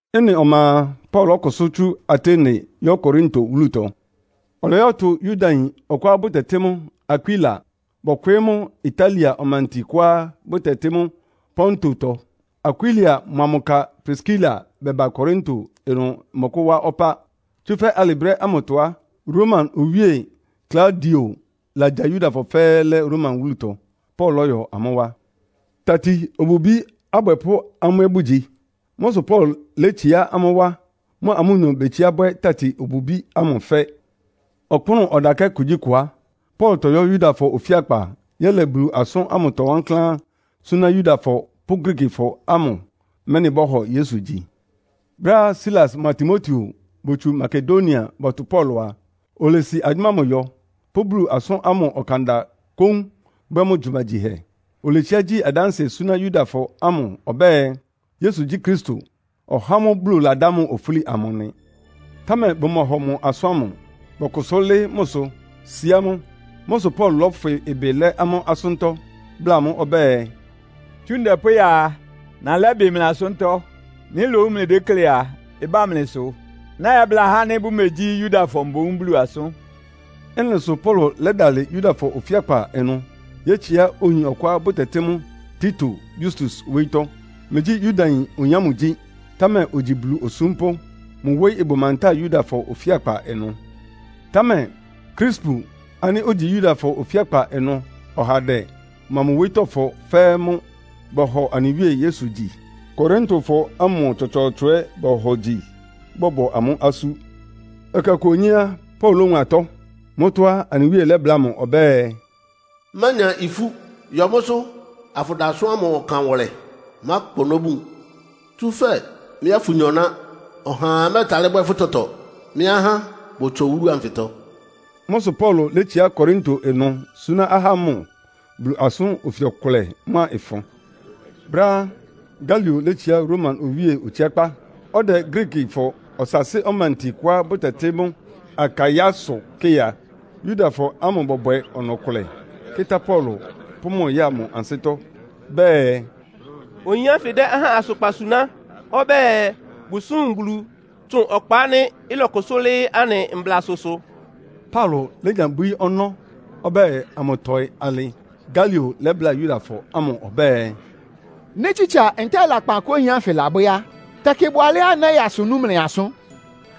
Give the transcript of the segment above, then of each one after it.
Ɩ́nɩ ɔma a, Paulo lɔ́kʋsʋ́ tsú Atene yɔ́ Korinto wúlutɔ. Ɔlɔyɔ́tʋ Yudayin ɔkʋá bʋtɛtɩ́ mʋ Akwila, bɔkwɩɩ́ mʋ Italia ɔmanti kʋá bʋtɛtɩ́ mʋ́ Pontotɔ. Akwila mʋa mʋ ka Priskila bɛba Korinto ɩnʋ mɔkʋ́wá ɔpá. Tsúfɛ́ alɩ brɛ́ ámʋtɔ á, Roma Owíe Klaudio lagya Yudafɔ fɛ́ɛ́ lɛ́ Roma wúlutɔ. Paulo lɔ́yɔ amʋ́ wá. Tati-obubí abwɛpʋ́ amʋ́ ɛ́ bʋgyi. Mʋ́ sʋ Paulo létsiá amʋ́ wá, mʋa mʋnyɔ betsiá bwɛ́ tati-obubí ámʋ fɛ́. Ɔkpʋ́nʋ́ ɔdakɛ́ kugyíkʋ á, Paulo tɔyɔ́ Yudafɔ ofíakpa yɛ́lɛ Bulu asʋ́n ámʋtɔ wankláán súná Yudafɔ pʋ́ Griikifɔ ámʋ, mɛ́nɩ bɔ́hɔ Yesu gyi. Brɛ́á Silas mʋa Timoteo botsu Makedonia bɔtʋ Paulo a, olesi agyʋ́má ámʋ yɔ, pʋ́ Bulu asʋ́n ámʋ ɔkanda kóún bwɛ́ mʋ gyumagyihɛ. Oletsiá gyi adánsɩɛ súná Yudafɔ ámʋ ɔbɛ́ɛ, Yesu gyí Kristo, (ɔhá ámʋ́ʋ́ Bulu ladá mʋ ofúli amʋ) nɩ. Támɛ bʋmɔhɔ mʋ asʋ́n ámʋ. Bɔkʋsʋ́ lɩ́ɩ́ mʋsʋ, síá mʋ. Mʋ́ sʋ Paulo lɔ́fwɩ ɩbɩ lɛ́ amʋ́ asʋ́ntɔ́, bláa amʋ́ ɔbɛ́ɛ, “Tsú ndɛ pʋ́ya a, nalɛ́ ɩbɩ mlɩ asʋ́ntɔ́. Nɩ́ lowu mlɩdéklé a, ɩbá mlɩsʋ. Nɛ́yɛ́bláa ahá ánɩ́ bʋmegyí Yudafɔ mboún Bulu asʋ́n.” Ɩ́nɩ sʋ Paulo lɛ́dalɩ Yudafɔ ofíakpa ɩnʋ yétsiá oyin ɔkʋá bʋtɛtɩ́ mʋ Tito Yustus wóyítɔ́. Megyí Yudayin oyin ámʋ gyí, támɛ ogyi Bulu osúmpʋ́. Mʋ wóyí ɩbʋ mantáa Yudafɔ ofíakpa ɩnʋ. Támɛ Krispu ánɩ́ ogyi Yudafɔ ofíakpa ɩnʋ ɔhandɛ mʋa mʋ wóyítɔ́fɔ fɛ́ɛ́ mʋ́ bɔhɔ anɩ Wíe Yesu gyi. Korintofɔ ámʋ tsɔtsɔɔtsɔ ɛ́ bohogyi, bɔ́bɔ amʋ́ asú. Ɛkɛ ɔkʋ onyé á, Paulo lówun atɔ́. Mʋ́tɔ́ á, anɩ Wíe lɛ́bláa mʋ ɔbɛ́ɛ, “Mánya ifú. Yɔ mʋ́sʋ́ afʋda asʋ́n ámʋ ɔkan wʋlɛ. Mákpa ɔnɔ́ bun. Tsúfɛ́ mɩ́a fʋnyɔ ná. Ɔhaa mɛ́ɛtalɩ́ bwɛ́ fʋ́ tɔtɔ. Mɩ́ ahá bʋtsɔ wúlu anfɩtɔ.” Mʋ́ sʋ Paulo létsiá Korinto ɩnʋ súná ahá ámʋ Bulu asʋ́n ofi ɔkʋlɛ mʋ́a ɩfʋn. Brɛ́á Galio létsiá Roma owíe otsiákpá, ɔdɛ Griikifɔ ɔsaasɩ́ ɔmanti kʋá bʋtɛtɩ́ mʋ́ Akaiasʋ kɩ́ɩ a, Yudafɔ ámʋ bɔbwɛ ɔnɔ-ɔkʋlɛ, kɩ́tá Paulo, pʋ́ mʋ ya mʋ ansɩ́tɔ́. Bɛɛ, “Oyin ánfɩ dɛ́ ahá asʋkpan suná ɔbɛ́ɛ bʋsúm Bulu tsʋn ɔkpa ánɩ́ ɩlɔkʋsʋ́ lɩ́ɩ́ anɩ mblasʋsʋ.” Paulo lénya bwíí ɔnɔ́ ɔbɛ́ɛ amʋtɔɩ alɩ Galio lɛ́bláa Yudafɔ ámʋ ɔbɛ́ɛ, “Nɩ́ tsitsa ntɛ́ɛ lakpan kʋ oyin ánfɩ labwɛ́ á, tɛkɩ ɩbʋ alɛ́á nɛ́yaa asʋ nú mlɩ asʋ́n.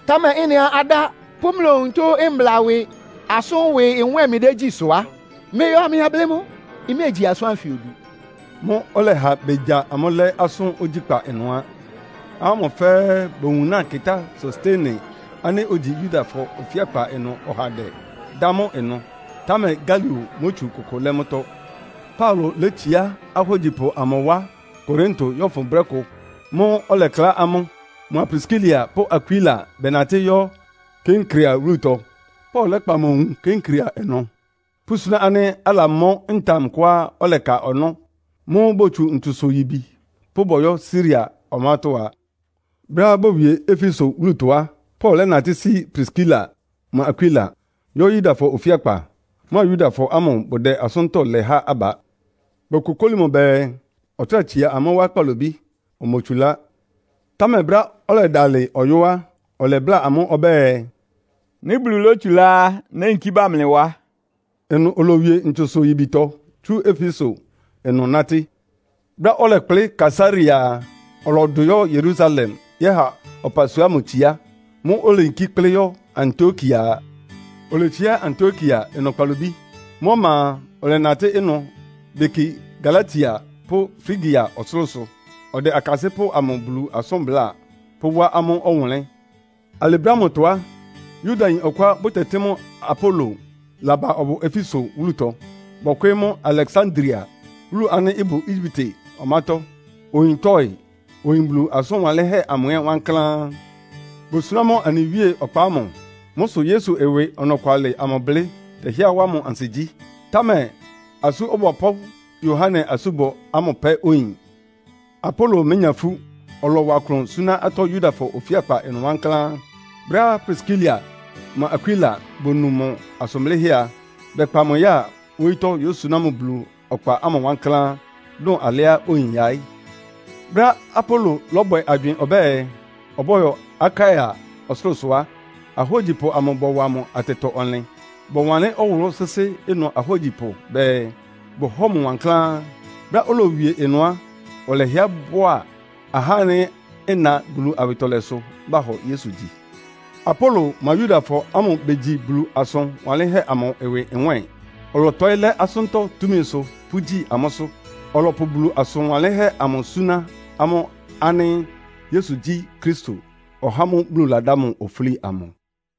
Támɛ ɩ́nɩá adá pʋ́ mlɩ onutó mbla ɩwɩ asʋ́n ɩwɩ nwɛ́ɛn mlɩdégyí sʋ á, mlɩyɔ amlɩyɛblɩ́ mʋ́. Mméegyi asʋ́n ánfɩ odu.” Mʋ́ʋ́ ɔlɛha begya amʋ́ lɛ́ asʋ́n ogyíkpá ɩnʋ á. Ahá ámʋ fɛ́ɛ́ bowunáa kɩ́tá Sostene ánɩ́ ogyi Yudafɔ ofíakpa ɩnʋ ɔhandɛ, dá mʋ ɩnʋ. Támɛ Galio mótsu kʋkʋ lɛ́ mʋ́tɔ́. Paulo létsiá ahógyipʋ amʋ wá Korinto yɔ́fʋn brɛ́ kʋ. Mʋ́ʋ́ ɔlɛklá amʋ́, mʋa Priskila pʋ́ Akwila bɛnatɩ́ yɔ́ Kenkrea wúlutɔ. Paulo lɛ́kpa mʋ nwun Kenkrea ɩnʋ, pʋ́súná ánɩ́ alamɔ́ ntam kʋá ɔlɛka ɔnɔ́. Mʋ́ʋ́ botsu ntsusʋ-yibi pʋ́ bɔyɔ́ Siria ɔmátɔ́ á. Brɛ́á bowie Efeso wúlutɔ á, Paulo lɛ́natɩ́ sí Priskila mʋa Akwila, yɔ́ Yudafɔ ofíakpa, mʋa Yudafɔ ámʋ bʋdɛ asʋ́ntɔ́ lɛ há aba. Bokokóli mʋ bɛɛ, ɔtráa tsia amʋ́ wá kpalobí, omotsulá. Támɛ brɛ́á ɔdɛdalɩ ɔyɔ́ á, ɔlɛbláa amʋ́ ɔbɛ́ɛ, “Nɩ́ Bulu lótsulá á, néyinkí ba mlɩ wá.” Ɩnʋ olowie ntsusʋ-yibitɔ tsú Efeso ɩnʋ nátɩ́. Brɛ́á ɔlɛkplɩ́ Kaesarea a, ɔlɔdʋ yɔ́ Yerusalem yɛ́ha ɔpasua ámʋ tsiá. Mʋ́ʋ́ oleyinkí kplɩ́ yɔ́ Antiokia a. Oletsiá Antiokia ɩnʋ kpalobí. Mʋ́ ɔma a, ɔlɛnatɩ́ ɩnʋ beki Galatia pʋ́ Frigia ɔsʋlʋ́sʋ, ɔdɛ akasɩ́pʋ́ amʋ Bulu asʋ́n bláa, pʋ́wá amʋ́ ɔwʋnlɩ́n. Alɩ brɛ́ ámʋtɔ á, Yudayin ɔkʋá bʋtɛtɩ́ mʋ Apolo laba ɔbʋ Efeso wúlutɔ. Bɔkwɩɩ́ mʋ Aleksandria, wúlu ánɩ́ ɩbʋ Egyipte ɔmátɔ́. Oyin tɔɩ́, oyin Bulu asʋn wanlɩ́nhɛ́ amʋ ɛ́ wankláán. Bosuná mʋ anɩ Wíe ɔkpa ámʋ. Mʋ́ sʋ Yesu ɩwɩ ɔnɔkwalɩ amʋ blɩ́ tɛhɩ́ɛ́ wá mʋ ansigyí. Támɛ Asú Ɔbɔpʋ́ Yohane asúbɔ ámʋ pɛ́ oyin. Apolo ménya ifú. Ɔlɔwa klʋn súná atɔ́ Yudafɔ ofíakpa ɩnʋ wankláán. Brɛ́á Priskila mʋa Akwila bonu mʋ asʋn blɩ́hɛ́ a, bɛkpa mʋ yáa wóyítɔ́ yósuná mʋ Bulu ɔkpa ámʋ wankláán dʋn alɩá oyin yaɩ́. Brɛ́á Apolo lɔ́bwɛ agywɩɩn ɔbɛ́ɛ, ɔbɔ́yɔ Akaia ɔsʋlʋ́sʋ á, ahógyipʋ amʋ bɔwa mʋ atɛtɔ-ɔnlɩn. Bɔwanlɩ́n ɔwʋlʋ́ sɩ́sɩ́ ɩnʋ ahógyipʋ bɛɛ, bʋhɔ́ɔ mʋ wankláán. Brɛ́á oloyówie ɩnʋ á, ɔlɛhɩɛ bʋ́a ahá ánɩ́ ɩna Bulu awɩtɔlɛsʋ bahɔ Yesu gyi. Apolo mʋa Yudafɔ ámʋ begyi Bulu asʋn wanlɩ́nhɛ́ amʋ ɩwɩ nwɛ́ɛn, ɔlɔtɔɩ́ lɛ́ asʋ́ntɔ́ túmisʋ pʋ́gyi amʋ́sʋ́. Ɔlɔpʋ Bulu asʋn wanlɩ́nhɛ́ amʋ súná amʋ́ ánɩ́ Yesu gyí Kristo, (ɔhá ámʋ́ʋ́ Bulu ladá mʋ ofúli amʋ).